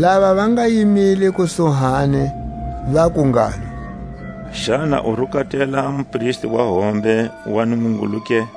Lava va nga yimile kusuhani vaku ngalo: Xana u rukatela a mupristi wa hombe wa Nungungulu ke?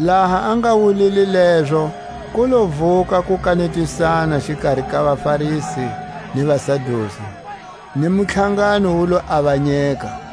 Laha a nga wulile lezo, ku lo vuka a kukanetisana xikari ka vaFarisi ni vaSadusi, ni mutlhangano wu lo avanyeka.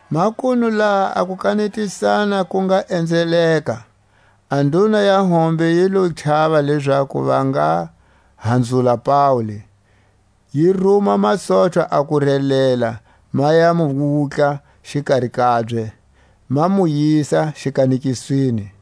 Makunu laha a kukanetisana ku nga enzeleka, a nduna ya hombe yi lo chava lezaku va nga hanzula Paule, yi ruma masochwa a ku relela ma ya mu wutla xikari kabye, ma mu yisa xikanekisweni.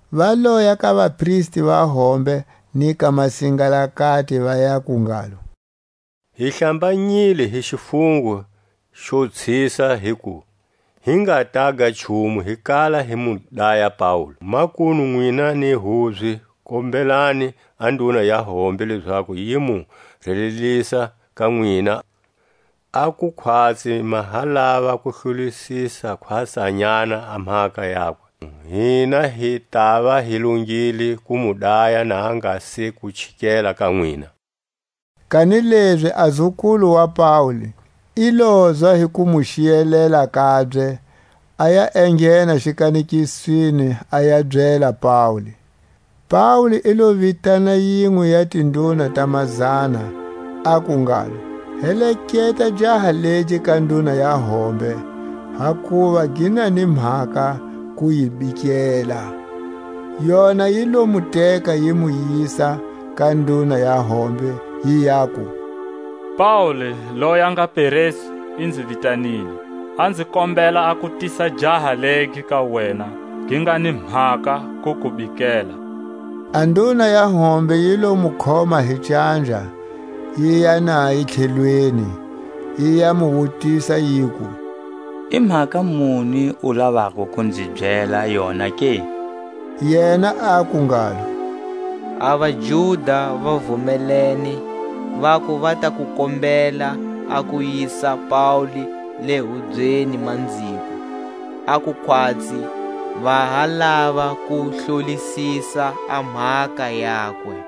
Va loya ka vapristi va hombe ni ka masingalakati, va yaku ngalo: Hi hlambanyile hi xifungo xo tshisa hiku hi nga taga nchumu hi kala hi mu daya Paule. Makunu nwina ni hubye, kombelani a nduna ya hombe lezaku yi mu relelisa ka nwina, a ku khwatsi ma ha lava ku hlolisisa khwatsanyana a mhaka yakwe; hina hi tava hi longile ku mu daya na a nga se ku chikela ka nwina. Kanilezi a zukulu wa Paule i lozwa hi ku mu xiyelela kabye, aya enghena xikanekisweni a ya byela Paule. Paule i lo vitana yinwe ya tinduna ta mazana, aku ngalo: Heleketa jaha legi ka nduna ya hombe, hakuva gi na ni mhaka ku yi bikela. Yona yi lo mu teka yi mu yisa ka nduna ya hombe, yi yaku: Paule loyi a nga peresu i nzi vitanile, a nzi kombela a ku tisa jaha legi ka wena, gi nga ni mhaka ku ku bikela. A nduna ya hombe yi lo mu khoma hi canja, yiya naye tlhelweni, yi ya mu wutisa, yiku: I mhaka muni u lavako ku nzi byela yona ke? Yena aku ngalo: A vaJuda va vumelene vaku va ta ku kombela a ku yisa Paule le hubyeni manziko, a ku khwatsi va ha lava ku hlolisisa a mhaka yakwe.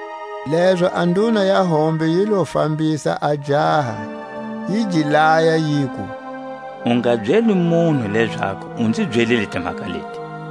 Lezo a nduna ya hombe yi lo fambisa a jaha, yi gi laya yiku: U nga byeli munhu lezaku u nzi byelile timhaka leti.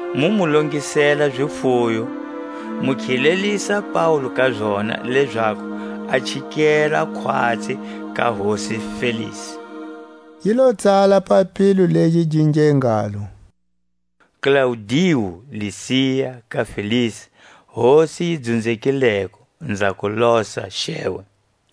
mu mu longisela zifuyo, mu khilelisa Paule ka zona, lezaku a chikela khwatsi ka hosi Felisi. Yi lo tsala papilo legi gi nge ngalo: Klaudiu Lisia ka Felisi, hosi yi dzunzekileko, nza ku losa, Xewe!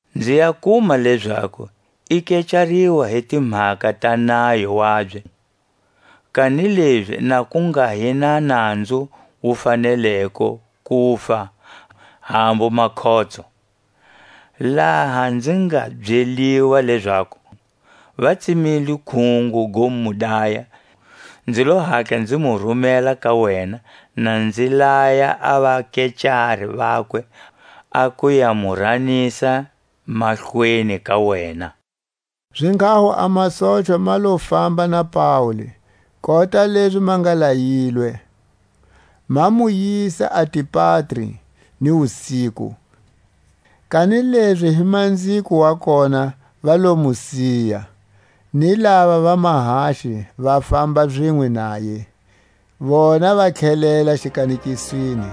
nzi ya kuma lezaku i kecariwa hi timhaka ta nayo wabye, kanilezi na ku nga hi na nanzu wu faneleko kufa, hambu makhotso. Laha nzi nga byeliwa lezaku va tsemile khungo go mu daya, nzi lo Hatla nzi mu rumela ka wena, na nzi laya a vakecari vakwe a ku ya mu ranisa mahlweni ka wena. Zinghaho a masochwa ma lo famba na Paule kota lezi ma nga layilwe, ma mu yisa Antipatri ni wusiku. Kanilezi hi manziko wa kona va lo mu siya ni lava va mahaxi va famba zinwe naye, vona va tlhelela xikanekisweni.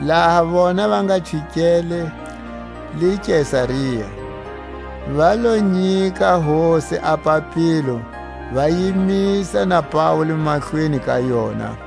Laha vona va nga chikele le Kesaria, va lo nyika hosi a papilo, va yimisa na Paule mahlweni ka yona.